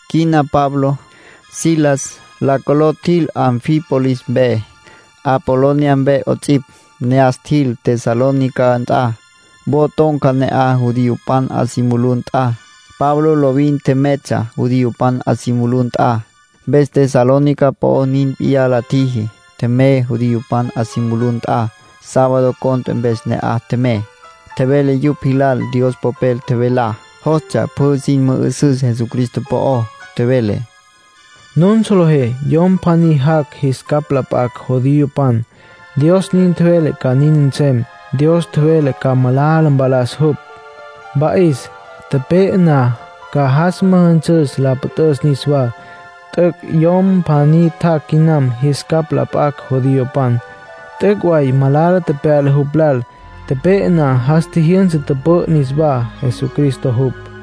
Quina Pablo, Silas, la coló tjil Anfípolis mpe, Apolonia mpe 'ots'ipj. Ne'as tjil Tesalónica nt'a. Wo ton̈ca ne'aj judiopan 'a si mulú nt'a. Pablo lovin tjemeytsja judiopan 'a si mulú nt'a. Mpes Tesalónica po'o nin p'iyá la tjiji. Tjemey judiopan 'a si mulú nt'a. Sábado cont'e mpes ne'aj tjemey. Tjevele yupj jilal Dios Popel tjevelá. Jostsja pjü sin mü'üsüs Jesucristo po'ó. Tjevele: “Nun solejé yom pjaní jac' jis capj la p'acj judiopan, Dios nin tjevele ca nin nsem. Dios tjevele ca malala mpalas jupj, mpa'is. Tepe'e na, ca jas müjünsüs la püt'üs niswá. T'üc' yom pjaní tjac' quinam jis capj la p'acj judiopan. T'üc' way malala tepyala jupj lal. Tepe'e na, jas tjijyünsa, tüpü'ü niswá. Jesucristo jupj”, nin tjevele.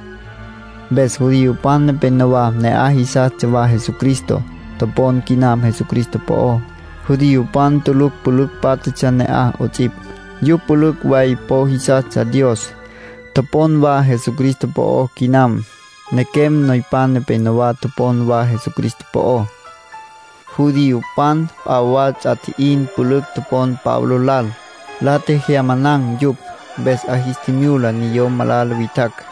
Mpes judiopan nepenowá ne'aj jisastsja wa Jesucristo. Topon quinam Jesucristo po'ó. Judiopan tulucj pülücj pátjatsja ne'aj 'ots'ipj, yupj pülücj way po jisastsja Dios. Topon wa Jesucristo po'ó quinam. Nequem noypan nepenowá topon wa Jesucristo po'ó. Judiopan p'a wa ts'a tji'in pülücj topon Pablo lal. La tjejyamanan̈ yupj. Mpes 'a jis tjimyula niyom malala witjacj.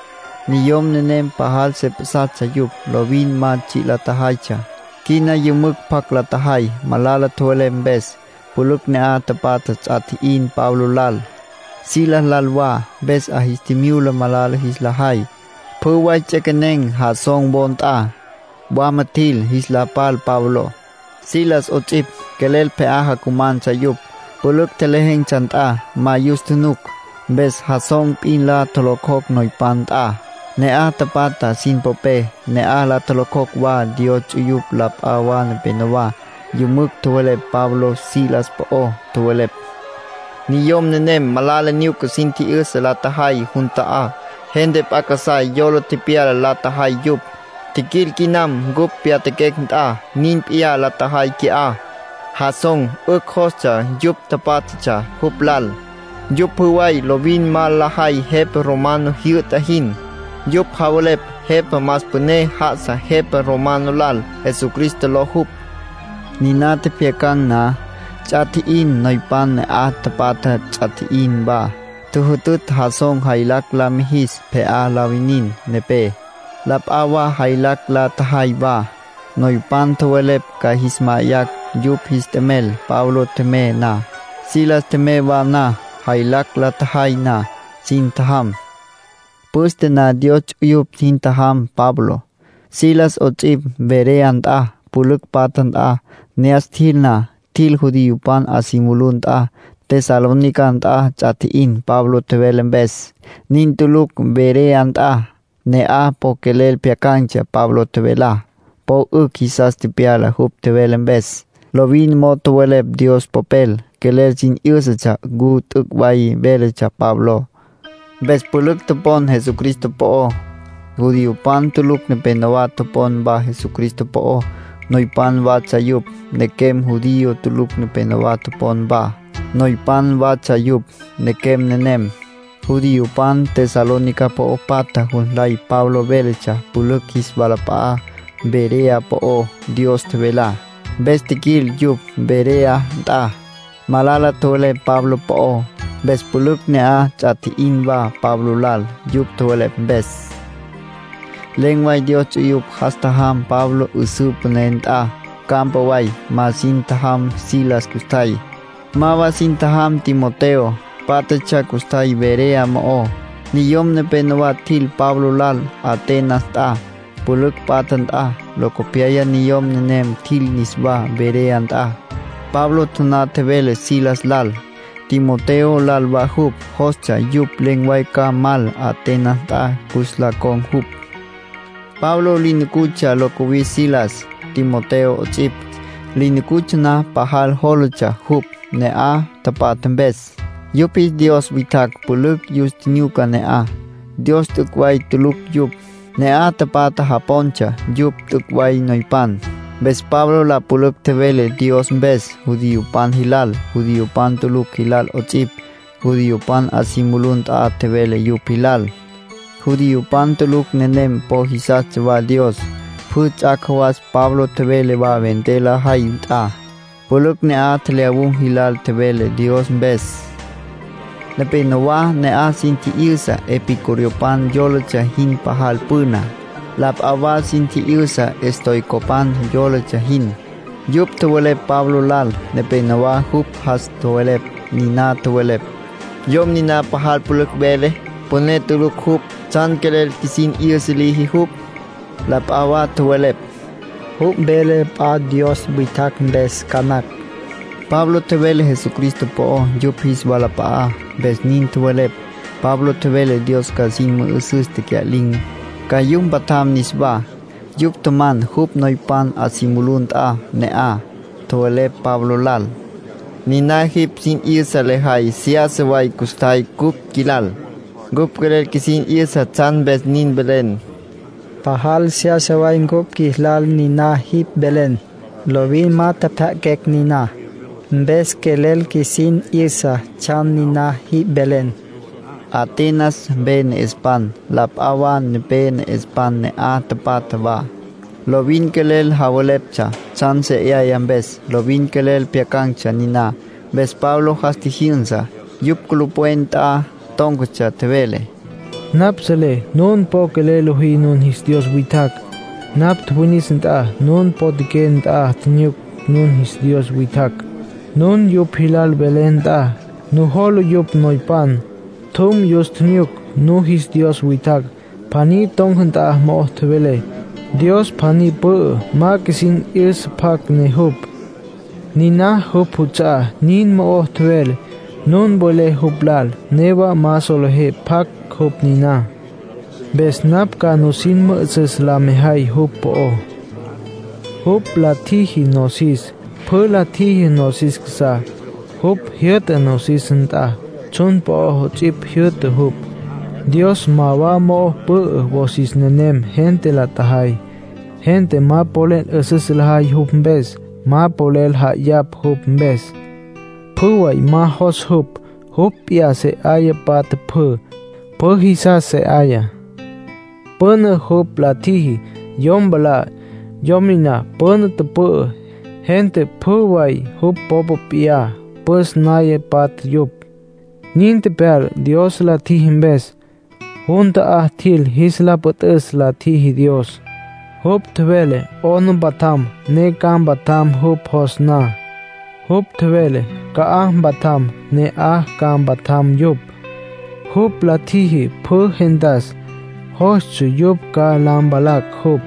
Niyom nenem pajal se pjasatsja yupj, lovin ma tsji' la tjajaytsja. Quina yümücj pjac la tjajay. Malala tjowelepj mpes, pülücj ne'aj tapatja ts'a tji'in Pablo lal, Silas lal wa, mpes 'a jis tjimyula malala jis la jay. Pjü way ts'equenen̈ Jasón wo nt'a. Wama tjil, jis la pal Pablo, Silas 'ots'ipj. Quelel pje'á jacumantsja yupj, pülücj tjelejen̈tsja nt'a. Ma yus tjunuc. Mpes Jasón p'in la tjolocjocj noypan nt'a, ne'aj tapatja sin popé. Ne'aj la tjolocjocj wa Dios ts'uyupj la p'a wa nepenowá. Yümücj tjowelepj Pablo, Silas po'ó. Tjowelepj: “Niyom nenem malala nyuca sin tji'yüsa la tjajay jun ta'á. Gente p'a casá yola tepyala la tjajay yupj. Tjiquil quinam cupj pyatjaquecj nt'a, nin p'iyá la tjajay qui'á. Jasón 'ücj jostsja yupj tapátjatsja jupj lal. Yupj pjü way lovin ma lajay jepa romano jyü'ta jin. Yupj javelepj jepa más püné já'asa jepa romano lal, Jesucristo ló jupj”, nin tjowelepj. Niná tjepjyacan̈ na, ts'a tji'in. Noypan ne'aj tapatja ts'a tji'in wa. Tjüjütütj Jasón jaylacj la mijis pje'á la winin nepé. La p'a wa jaylacj la tjajay wa. Noypan tjowelepj ca jis ma'ayacj yupj jis t'emel Pablo tjemey na, Silas tjemey wa na. Jaylacj la tjajay na, sin tjajam. Püste na Dios ts'uyupj sin tjajam Pablo, Silas 'ots'ipj Berea nt'a, pülücj patja nt'a. Ne'as tjil na, tjil judiopan 'a si mulú nt'a. Tesalónica nt'a ts'a tji'in Pablo tjevele mpes. Nin tuluctsja Berea nt'a. Ne'aj po quelel pjyacan̈tsja Pablo tjevelá. Po 'ücj jisas tepyala jupj tjevele mpes. Lovin mo'o tjowelepj Dios Popel. Quelel sin 'yǘsatsja ncu t'üc' way véletsja Pabló. Mpes pülücj topon Jesucristo po'ó. Judiopan tulucj nepenowá topon wa Jesucristo po'ó. Noypan watsja yupj. Nequem judío tulucj nepenowá topon wa. Noypan watsja yupj, nequem nenem. Judiopan Tesalónica po'o patja jus nlay Pablo véletsja pülücj jis walap'a'á Berea po'ó Dios tjevelá. Mpes tjiquil yupj Berea nt'a, malala tjowelepj Pablo po'ó. Mpes pülücj ne'aj ts'a tji'in wa Pablo lal, yupj tjowelepj mpes. Len̈ way Dios ts'uyupj jas tjajam Pablo 'üsǘ püné nt'a, campa way. Ma sin tjajam Silas custjay. Ma wa sin tjajam Timoteo. Pátjatsja custjay Berea mo'ó. Niyom nepénowa tjil Pablo lal Atenas nt'a, pülücj patja nt'a. Locopyaya niyom nenem tjil niswá Berea nt'a. Pablo taná tjevele Silas lal, Timoteo lal wa jupj jostsja yupj len̈ way ca mal Atenas nt'a cus la con̈ jupj. Pablo li nucutsja lo cuwis Silas, Timoteo 'ots'ipj. Li nucutsja na pajal jólatsja jupj ne'aj tapatja mpes. Yupj jis dios witjacj pülücj yus tjinyuca ne'aj, Dios t'üc' way tuluctsja yupj. Ne'aj tapatja japontsja yupj t'üc' way noypan. Mpes Pablo la pülücj tjevele Dios mpes judiopan jilal, judiopan tulucj jilal 'ots'ipj. Judiopan 'a si mulú nt'a tjevele yupj jilal. Judiopan tulucj nenem po jisastsja wa Dios. Pjü ts'ac' jawas Pablo tjevele wa vender lajay nt'a. Pülücj ne'aj tjelyawun̈ jilal tjevele Dios mpes. Nepénowa ne'aj sin tji'yüsa epicureopan yólatsja jin pajal püna. La p'a wa sin tji'yüsa estoicopan yólatsja jin. Yupj tjowelepj Pablo lal. Nepénowa jupj jas tjowelepj. Niná tjowelepj: “Yom niná pajal pülücj vele. Püné tulucj jupj. ¿Tsjan quelel qjuisin 'yüsa liji jupj?” nin la tjü'üy. La p'a wa tjowelepj: “Jupj vele p'a dios witjacj mpes ca nacj”. Pablo tjevele Jesucristo po'ó yupj jis walap'a'á, mpes nin tjowelepj. Pablo tjevele Dios ca sin müjünsüs tecya'lin̈, ca yupj mpatjam niswá. Yupj tjaman jupj noypan 'a si mulú nt'a ne'aj. Tjowelepj Pablo lal: —Niná jipj sin 'yüsa lejay seyasa way custjay cupj qjuilal. Cupj quelel qjuisin 'yüsa tsjan mpes nin velen. Pajal seyasa way cupj qjuilal niná jipj velen. Lovin ma tjepjya'aquecj niná. Mpes quelel qjuisin 'yüsa tsjan niná jipj velen —nin tjowelepj. Atenas mpe ne'espan, la p'a mpe ne'espan ne'aj tapatja wa, lovin quelel javeleptsja tsjan seyasa mpes, lovin quelel pjyacan̈tsja niná. Mpes Pablo jas tjijyünsa, yupj culupwen nt'a tón̈catsja. Tjevele: —Napj selé nun po quelel lojí nun jis dios witjacj. Napj tjuwinis na nun potjaqué nt'a, tjinyuc nun jis dios witjacj, nun yupj jilal welé nt'a. Nujola yupj noypan. Tjum, yus tjinyuc nun jis dios witjacj. Pjaní ton̈ca nt'a mo'o tjevelé: ‘Dios pjaní pü'ü ma qjuisin tji'yüsa pjacj ne jupj. Niná jupj juts'a'á’, nin mo'o tjevelé. Nun welé jupj lal, newa ma solejé pjacj jupj niná. Mpes napj ca nusin mü'üsüs la mejay jupj po'ó. ”Jupj la tjiji nosis. Pjü la tjiji nosis casa'á. Jupj jyü'ta nosis nt'a, tsjun po'ó 'ots'ipj jyü'ta jupj. Dios ma wa mo'ó pü'ü, wosis nenem gente la tjajay. Gente ma polel 'üsüs lajay jupj mpes, ma polel ja'ayapj jupj mpes. Pjü way ma jos jupj. Jupj p'iyá se 'aya patja pjü. Pjü jisas se 'aya. ”Püna jupj la tjiji yom mwalá. Yom niná püna tüpü'ü, gente pjü way jupj popa p'iyá püs naya patja yupj. Nin tepyala Dios la tjiji mpes. Jun ta'á tjil jis la püt'üs la tjiji Dios. Jupj tjevele 'ona mpatjam, ne ca mpatjam jupj jos na. Jupj tjevele ca'aj mpatjam, ne ne'aj ca mpatjam yupj. Jupj la tjiji pjü gentas, jostsja yupj ca la mpalacj jupj.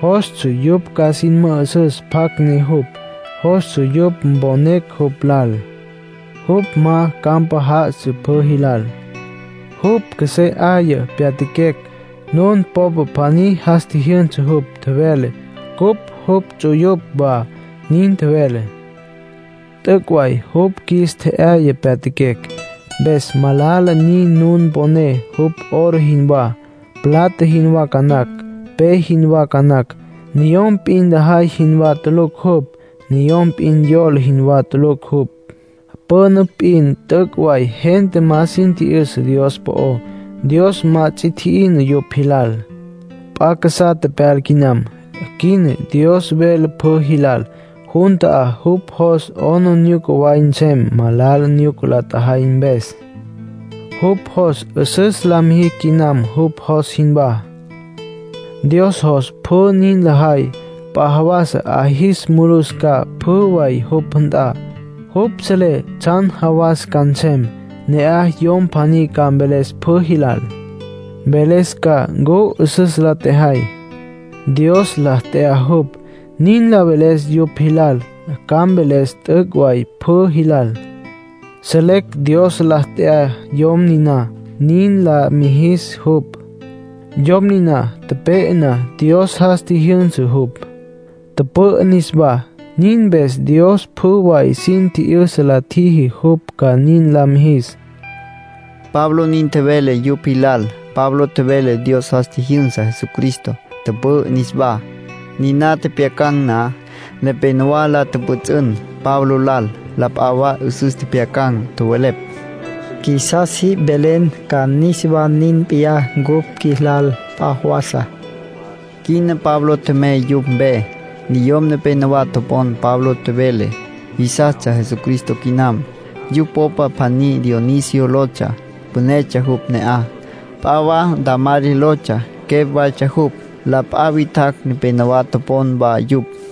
Jostsja yupj ca sin mü'üsüs pjacj ne jupj. Jostsja yupj mponecj jupj lal. Jupj ma campa já'asa pjü jilal. Jupj qjuesé 'aya pyatjaquecj. Nun popa pjaní jas tji'yüsa jupj, tjevele: ‘Cupj jupj ts'uyupj wa’, nin tjevele. ”T'üc' way jupj qjuis tje'yaya pyatjaquecj. Mpes malala nin nun poné jupj oro jinwá, plata jinwá ca nacj, pe jinwá ca nacj. Niyom p'in lajay jinwá tulucj jupj. Niyom p'in yola jinwá tulucj jupj. Püna p'in t'üc' way gente ma sin tji'yüsa Dios po'ó. Dios ma ts'i tji'ina yupj jilal. P'a casá tepyala quinam. Quina Dios vele pjü jilal jun ta'á jupj jos 'aplijila way nsem malala nyuca la tjajay mpes. Jupj jos 'üsüs la mijicj quinam jupj jos jinwá. Dios jos pjü nin lajay. P'a jawas 'a jis mulus ca pjü way jupj nt'a. Jupj selé tsjan jawas ca nsem. Ne'aj Yom pjaní ca mveles pjü jilal. Mveles ca ncu 'üsüs la tjajay. Dios la t'ya jupj nin la veles yupj jilal. Ca mveles t'üc' way pjü jilal. Selecj Dios la t'ya Yom niná, nin la mijis jupj. Yom niná tepe'e na Dios jas tjijyünsa jupj, tüpü'ü niswá. Nin mpes Dios pjü way sin tji'yüsa la tjiji jupj ca nin la mijis —Pablo nin tjevele yupj jilal. Pablo tjevele Dios jas tjijyünsa Jesucristo, tüpü'ü niswá. Niná tjepjyacan̈ na, nepénowa la tjüpjüts'ün Pablo lal. La p'a wa 'üsüs tjepjyacan̈. Tjowelepj: —Qjuisas jipj mvelen ca niswá nin p'iyá cupj qjuilal p'a jawasa. Quina Pablo tjemey yupj mpe. Niyom nepénowa topon Pablo tjevele, jisastsja Jesucristo quinam. Yupj popa pjaní Dionisio lotsja. Pünetsja jupj ne'aj. P'a wa Dámaris lotsja, quepj waytsja jupj. La p'a witjacj nepenowá topon wa yupj.